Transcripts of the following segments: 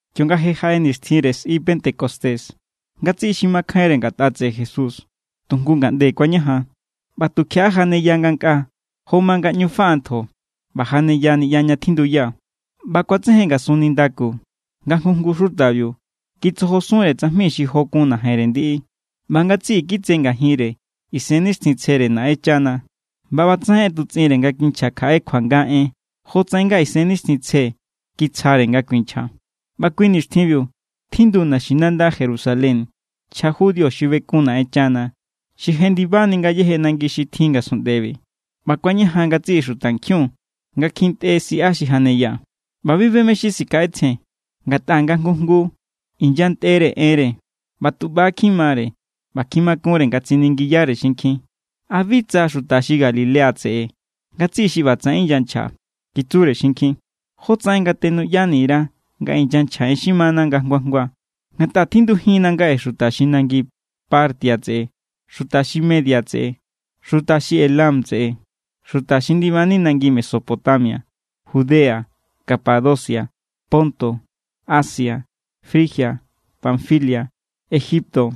Kionga jaꞌe nixtjinre sꞌi Pentecostés, ngatsiꞌi xi makjainre ngatꞌa tseꞌe Jesús tu jngu ngaꞌnde kuañajan. ꞌBa tukjiaꞌa janeya ngankꞌa jo ma nga ꞌñu faꞌa ntjo, ꞌba janeya niꞌya ña tjinduya. ꞌBa kuatsejen ngasun nindaku nga jngu jngu xutabiu kitsojosunre tsajmi xi jo kun najenre ndiꞌi. ꞌBa ngatsiꞌi kitse ngajinre Isennixtjintsjere Naꞌenchana. ꞌBa ꞌbatsaꞌen ꞌetutsꞌinre nga kinchja kjaꞌe kuanga en jotsaꞌen nga Isennixtjintsje kitsjare nga kuinchja. ꞌBa kui nixtjinbiu tjindu naxinanda Jerusalén nchja judío xi bekun Naꞌenchana, xi jendibani ngayéje nangi xi tjin ngasunꞌndebi. ꞌBa kuañajan ngatsiꞌi xutankjiun nga kjintꞌe siꞌa xi janeya, ꞌba bi be mé= xi sikjaꞌetsjen, ngatꞌa nga jngu jngu inyantꞌere enre. ꞌBa tu ꞌba= kjimare ꞌba kjimakunre nga tsiningiyare xinkjin: —¿A bi tsa xuta xi Galilea tseꞌe ngatsiꞌi xi ꞌbatsaꞌen inyanchja? —kitsure xinkjin—. ¿Jótsaꞌen nga tenuꞌyani_ra nga inyanchja en xi mana nga jngu jngua? Ngatꞌa tjindujinna ngaꞌe xuta xi nangi Partia tseꞌe, xuta xi Media tseꞌe, xuta xi Elam tseꞌe, xuta xi ndibani nangi Mesopotamia, Judea, Capadocia, Ponto, Asia, Frigia, Panfilia, Egipto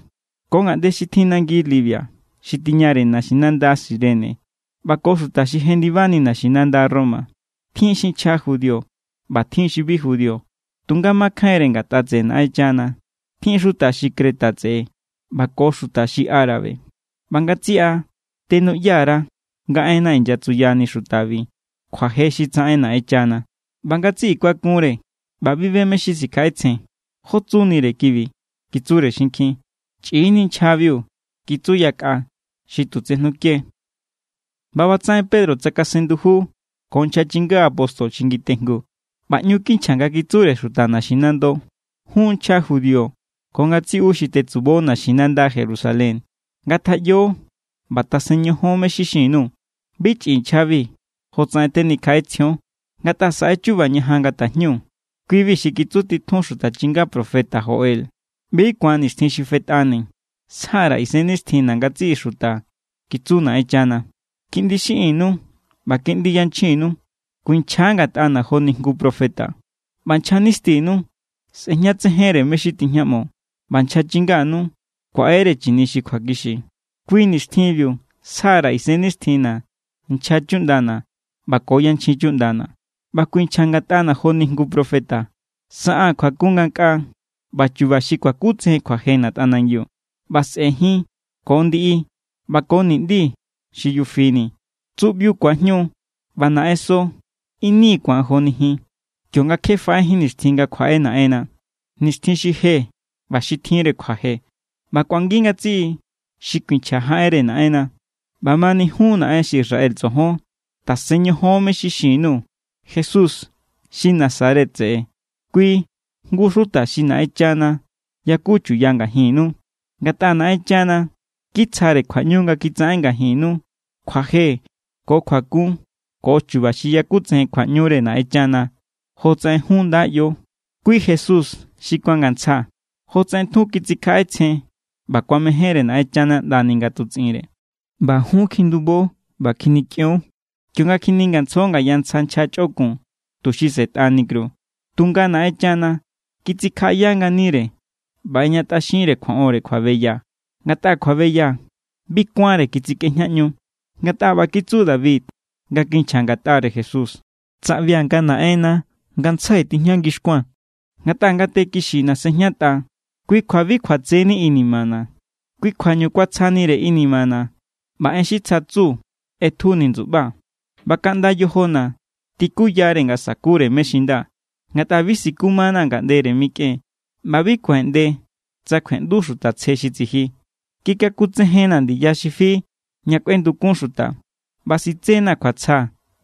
ko ngaꞌnde xi tjin nangi Libia xi tiñare naxinanda Cirene ꞌba ko xuta xi jendibani naxinanda Roma. Tjin xi nchja judío ꞌba tjin xi bi judío tunga makjainre ngatꞌa tseꞌe Naꞌenchana. Tjin xuta xi Creta tseꞌe ꞌba ko xuta árabe. ꞌBa ngatsiꞌa tenuꞌya_ra nga enna inyatsuyani xutabi kjuaje xi tsaꞌen Naꞌenchana. ꞌBa ngatsiꞌi kuakunre ꞌba bi be mé= xi sikjaꞌetsjen. —¿Jó tsunire kibi? —kitsure xinkjin. —Chꞌi=ni nchjabiu —kitsu yakꞌa xi tu tsejnuke. ꞌBa ꞌbatsaꞌen Pedro tsakasen nduju ko nchja apóstol xi ngitejngu, ꞌba ꞌñu kinchja nga kitsure xuta naxinando: —Jun nchja judío ko ngatsiꞌu xi tetsubo naxinanda Jerusalén, ngatjaꞌyo ꞌba tasen ñojon mé= xi xin_nuu̱. Bi chꞌi nchjabi jotsaꞌen tenikjaꞌetsjion, ngatꞌa saꞌe= chuba ñajan nga tajñu. Kui=bi xi kitsutitjun xuta chinga profeta Joel: ꞌBi= ku̱an nixtjin xi fetꞌani, sja_ra̱ Isennixtjinna̱ ngatsiꞌi xuta, kitsu Naꞌenchana. Kiꞌndi xiꞌinnu ꞌba kiꞌndi yanchjinnu kuinchja ngatꞌana̱ joni jngu profeta, ꞌba nchja nistinu sꞌejñatsejenre mé= xi tijñaꞌmo, ꞌba nchja chinganu kuaꞌere chini xi kjuakixi. Kui nixtjinbiu sja_ra̱ Isennixtjinna̱ nchja chuꞌndana̱ ꞌba ko yanchjin chuꞌndana̱. ꞌBa kuinchja ngatꞌana̱ joni jngu profeta. Saꞌaa̱n kjuakun ngankꞌaa ꞌba chu̱ba̱ xi kuakutsejen kjuajena̱ tꞌanangiu, ꞌba sꞌe̱ jin ko ndiꞌi ꞌba ko niꞌndi xi yufi ni. Tsuꞌbiu ku̱ajñu ꞌba naꞌenso ini ku̱an joni jin, kionga kje faꞌejín nixtjin nga kjuaꞌe Naꞌenna, nixtjin xi je ꞌba xi tjinre kjuaje. ꞌBa kꞌuangi ngatsiꞌi xi kuinchja jaꞌenre Naꞌenna. ’ꞌBamani jun naꞌen xi Israel tsojon, tasen ñojon mé= xi xin_nuu̱. Jesús xi Nazaret tseꞌe, kui jngu xuta xi Naꞌenchana yaku chuya ngajinnu. Ngatꞌa Naꞌenchana kitsjare kjuaꞌñu nga kitsaꞌen ngajinnu kjuaje ko kjuakun ko chuba xi yakutsejen kjuaꞌñure Naꞌenchana jotsaꞌen jun nda ꞌyo. Kui Jesús xi kuangantsja, jotsaꞌen tjun kitsikjaꞌetsjen ꞌba kuamejénre Naꞌenchana ꞌndani nga ꞌetutsꞌinre. ꞌBa jun kjindubo ꞌba kjinikꞌion, kionga kjiningantsjo ngaya ntsja nchja chꞌokun tuxi sꞌetꞌani kru. Tunga Naꞌenchana kitsikjaꞌaya nganire ꞌba ꞌejñatꞌaxinre kjuaꞌonre kjuabeya, ngatꞌa kjuabeya bi kuánre kitsikꞌejñaꞌñu. Ngatꞌa ꞌba kitsu David nga kinchja ngatꞌare Jesús: Tsaꞌbia̱ nga Naꞌenna ngantsjai tijña ngixkuaa̱n. Ngatꞌa ngate kixina̱ sejñatꞌa, kui kjua bi kjuatseni inimana̱. Kui kjuañu kuatsjanire inimana̱, ꞌba en xi tsja tsu ꞌetjuni ndsuꞌbaa̱, ꞌba kaꞌnda yojona̱ tikuyare nga sa̱kure mé= xi nda. Ngatꞌa bi sikumanaa̱ ngaꞌndere mikꞌen, ꞌba bi kuaꞌeꞌnde tsa kjueꞌndu Xuta Tsje xi tsiji. Kikakutsejennaa̱ ndiya xi fi ña kꞌuendukun xuta, ꞌba sitsenaa̱ kjuatsja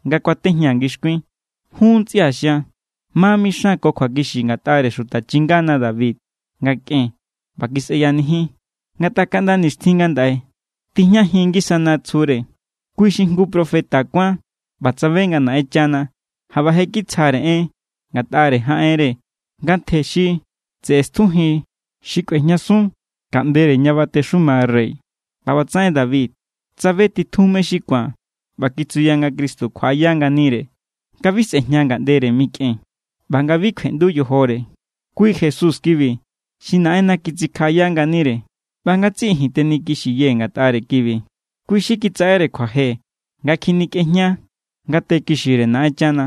nga kuatejñaa̱ ngixkuin. ’Jun ntsꞌia̱ xian, ma mixan ko kjuakixi ngatꞌare xuta chingana David nga kꞌen ꞌba kisꞌeyanijin, ngatꞌa kaꞌnda nixtjin ngandaꞌe tijñajin ngisana tsjure. Kui= xi jngu profeta kuán ꞌba tsabe nga Naꞌenchana jaꞌba je= kitsjare en ngatꞌare jaꞌenre nga ntje xi tseꞌe stjujin xi kꞌuejñasun ngaꞌndere ña batexuma rey. ꞌBa ꞌbatsaꞌen David tsabe titjun mé= xi ku̱an ꞌba kitsuya nga Cristo kjuaꞌaya nganire, nga bi sꞌe̱jña ngaꞌndere mikꞌen, ꞌba nga bi kjueꞌndu yojore. Kui Jesús kibi xi Naꞌenna kitsikjaꞌaya nganire, ꞌba ngatsiꞌi ji̱n tenikixiyee̱ ngatꞌare kibi. Kui xi kitsaꞌere kjuaje nga kjinikꞌejña ngate kixire Naꞌenchana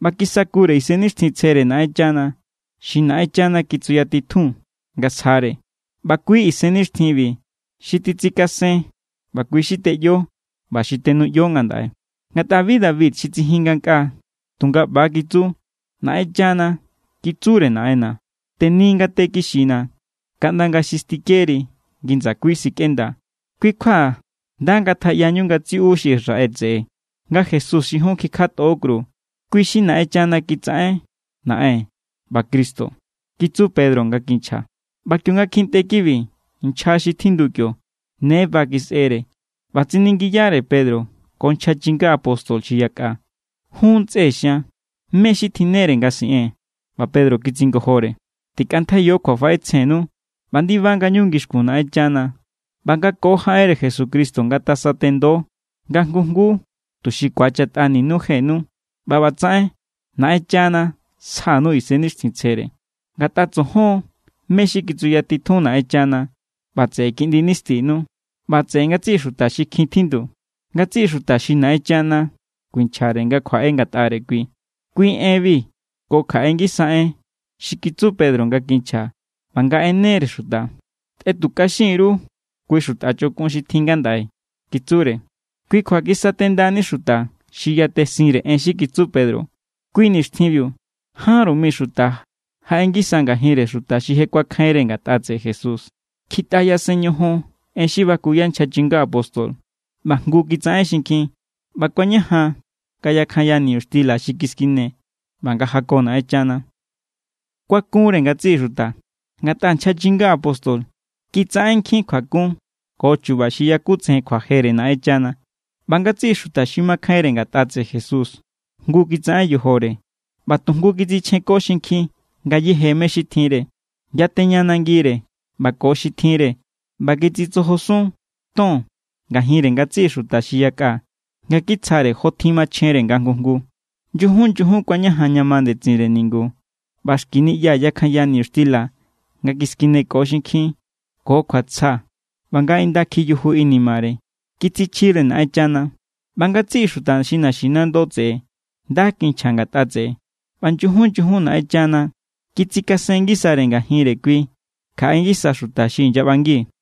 ꞌba kisakure Isennixtjintsjere Naꞌenchana xi Naꞌenchana kitsuyatitjun nga sjare. ꞌBa kui Isennixtjinbi xi titsikasen ꞌba kui xi teꞌyo ꞌba xi tenuꞌyo ngandaꞌe. Ngatꞌa bi David xi tsijin ngankꞌaa, tunga ꞌba= kitsu: Naꞌenchana kitsure Naꞌenna̱: “Teni ngate kixina̱, kaꞌnda nga xi stikeri ngi ndsakui sikꞌenda.” ’Kui kjua nda ngatjaꞌyañu ngatsiꞌu xi Israel tseꞌe, nga Jesús xi jun kikjatꞌo kru, kui= xi Naꞌenchana kitsaꞌen Naꞌen ꞌba Cristo —kitsu Pedro nga kinchja. ꞌBa kionga kjintꞌe kibi nchja xi tjindu kio, ne ba kisꞌere ꞌba tsiningiyare Pedro ko nchja chinga apóstol xi yakꞌa: —Jun ntsꞌe xian, ¿mé= xi tjinnere nga siꞌee̱n? ꞌBa Pedro kitsingojore: —Tikꞌantjaiyo kjuafaꞌetsjennu ꞌba ndiba ngañu ngixkun Naꞌenchana. ꞌBa nga ko jaꞌenre Jesucristo ngatasatendo nga jngu jngu tuxi ku̱achatꞌanu jenu ꞌba ꞌbatsaꞌen Naꞌenchana sjanu Isennixtjintsjere. Ngatꞌa tsojon mé= xi kitsuyatitjun Naꞌenchana, ꞌba tseꞌe kiꞌndi nistinu, ꞌba tseꞌe ngatsiꞌi xuta xi kjin tjindu, ngatsiꞌi xuta xi Naꞌenchana kuinchjare nga kjuaꞌe ngatꞌare Kui. Kui enbi ko kjaꞌe ngisa en xi kitsu Pedro nga kinchja ꞌba nga ꞌenere xuta. —Tꞌetutꞌaxin_ru kui xuta chꞌokun xi tjin ngandaꞌe —kitsure. Kui kjua kisatendani xuta xi yatesinre en xi kitsu Pedro. Kui nixtjinbiu jánru mi xuta jaꞌe ngisa ngajinre xuta xi je kuakjainre ngatꞌa tseꞌe Jesús. Kjitꞌa yasen ñojon en xi bakuya nchja chinga apóstol, ꞌba jngu kitsaꞌen xinkjin, ꞌba kuañajan nga yakjanya niñuxtila xi kiskine, ꞌba nga jako Naꞌenchana. Kuakunre ngatsiꞌi xuta, ngatꞌa nchja chinga apóstol kitsaꞌen nkjin kjuakun ko chuba xi yakutsejen kjuajere Naꞌenchana. ꞌBa ngatsiꞌi xuta xi makjainre ngatꞌa tseꞌe Jesús jngu kitsaꞌen yojore ꞌba tujngu kitsichjenko xinkjin ngayéje mé= xi tjinre. Yateña nangire ꞌba ko xi tjinre, ꞌba kitsitsojosun ton ngajinre ngatsiꞌi xuta xi yakꞌa nga kitsjare jó tjin machjenre nga jngu jngu. Nyujun nyujun kuañajan ña ma ndetsinre ningu ꞌba xki niꞌya yakjanya niñuxtila nga kiskineko xinkjin ko kjuatsja ꞌba nga inda kjiyuju inimare. Kitsichjire Naꞌenchana, ꞌba ngatsiꞌi xuta xi naxinando tseꞌe nda kinchja ngatꞌa tseꞌe. ꞌBa nyujun nyujun Naꞌenchana kitsikasen ngisare ngajinre kui kjaꞌe ngisa xuta xi inyaꞌbangi.